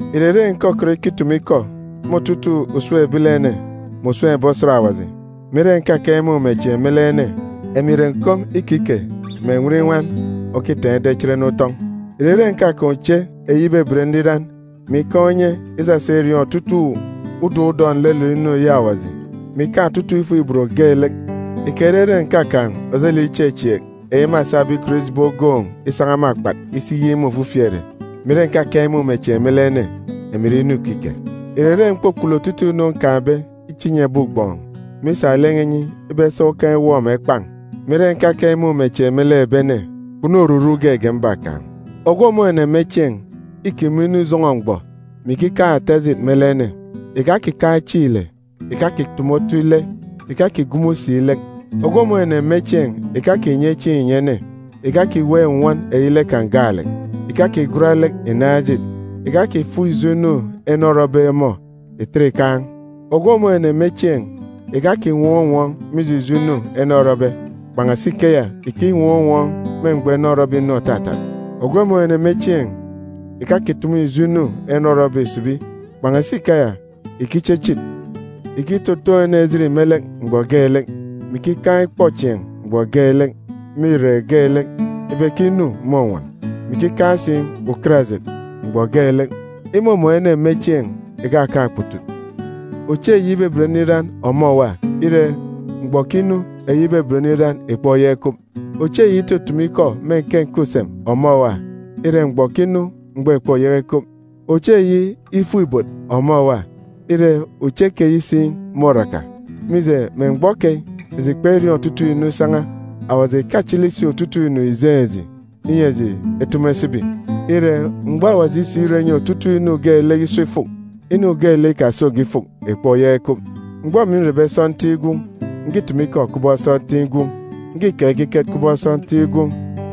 Ìrere ǹkọkọt ikitumu ikọ me otutuuk usem ebilene mè usem ebi osat Awaji, mè ire ǹkakaan̄ imumechieen̄ me lek ene, emi ìre nkom ikike mè enwirinwan òkitaan̄ ida ichit ene utọn̄. Ìrere ǹkakaan̄ uche eyi ibeben nriran, mè ikaan̄ unye isasa iriọọn̄ otutuuk udọk udọk nlelet inu eyi Awaji, mè ikaan̄ otutuuk ifuk-ibot geelek, ikerere ǹkakaan̄ ojelek ichechieek eyi mâsabe ikọt ijibi ogoon̄ isan̄a me akpat isi iyik me ofifi ere, mè ire ǹkakaan̄ imumechieen̄ me lek ene, emi ìre inu ikike. Ìrere m̀kpukpulu otutuuk inu nkaan̄be iche inyi ebi ugbọọn̄, mè isa lek n̄a inyi ibe ewọp me ukan̄ esa egwa ngwugwa,a mè ire ǹkakaan̄ imumechieen̄ me lek ebi ene, kpunu oruru geege mbakaan̄. Ogwu òmun̄ ene me chieen̄ îkime inu ijọn̄ọ mgbọ, mè ikikaan̄ ata ejit me lek ene. Ìkakikaan̄ chieen̄ ile, ìkakitumu otu ile, ìkakigumu si lek. Ogwu òmun̄ ene me chieen̄ ìkakinye chieen̄ ìnyi ene, ìkakiweek nnwọn eyi lek kan̄ gaalek, ìkakigwat lek ìnaan̄ ejit, ìkakifuk ijo inu ene orọbe ọmọ ìtet ìkaan̄. Ogwu òmun̄ ene me chieen̄ ìkakinwọọn̄ unwọọn̄ mije ijo inu ene orọbe. Kpan̄asi ikeya, ìkinwọọn̄ unwọọn̄ me mgbọ ene orọbe inu òtatat. Ogwu òmun̄ ene me chieen̄ ìkakitumu ijo inu ene orọbe ìsibi, kpan̄asi ikeya, ìkichichit. Ìkitotoon̄ ene ejit me lek mgbọ geelek, mè ikikaan̄ ikpọchieen̄ mgbọ geelek me irek geelek ibe ke inu mônwọn, mè ikikaan̄ si ukarajit mgbọ geelek. Imumun̄ ene me chieen̄ ìkakaan̄ okputut. Uche eyi ibeben nriran ọmọ òwa, ire, mgbọ òkinu eyi ibeben nriran ìkpoyaka ikup. Uche eyi itutumu ikọ me nke nke usem ọmọ òwa, ire, mgbọ òkinu mgbọ ìkpoyaka ikup. Uche eyi ifuk-ibot ọmọ òwa, ire, uche keyi si môraka. Mije, me mgbọ keyi, eji kperiọọn̄ otutuuk inu isan̄a, Awaji ìkachili si otutuuk inu ìjeen̄ eji, inyi eji etumu esibi. Ire, mgbọ Awaji isirọ inyi otutuuk inu geelek iso ifuk, inu geelek ikasoge ifuk ìkpoyaka ikup. Mgbọ emi nrebe sọntiik gwun̄, ǹkitumu ikọ kubọk sọntiik gwun̄, ǹkikeek ekiket kubọk sọntiik gwun̄,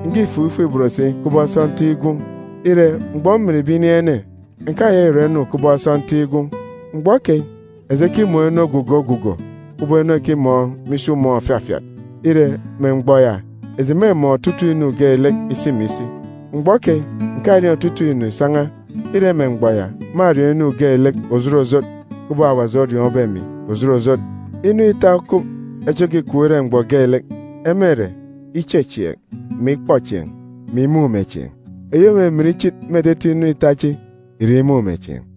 ǹkifuk ifuk-ibot si kubọk sọntiik gwun̄. Ire, mgbọ mminbe inin̄ ene, ǹkayaka ìkirọ inu kubọk sọntiik gwun̄. Mgbọ keyi, eji ekimọọn̄ inu ogugo ogugo, kubọk inu ekimọọn̄ me isi umọọn̄ òfafiat. Ire, me mgbọ ya, eji mêmọọn̄ otutuuk inu geelek isi mè isi. Mgbọ keyi, ǹkariọọn̄ otutuuk inu ìsan̄a. Ire, me mgbọ ya, mâriọọn̄ inu geelek òjot òjot kubọk Awaji oriọọn̄be emi òjot òjot. Inu ita okup, echi òkikup ire mgbọ geelek. Ema ìre ichechieek, mè ikpọchieen̄, mè imumechieen̄. Eyi òmimin ichit me etete inu ita chi ìre imumechieen̄.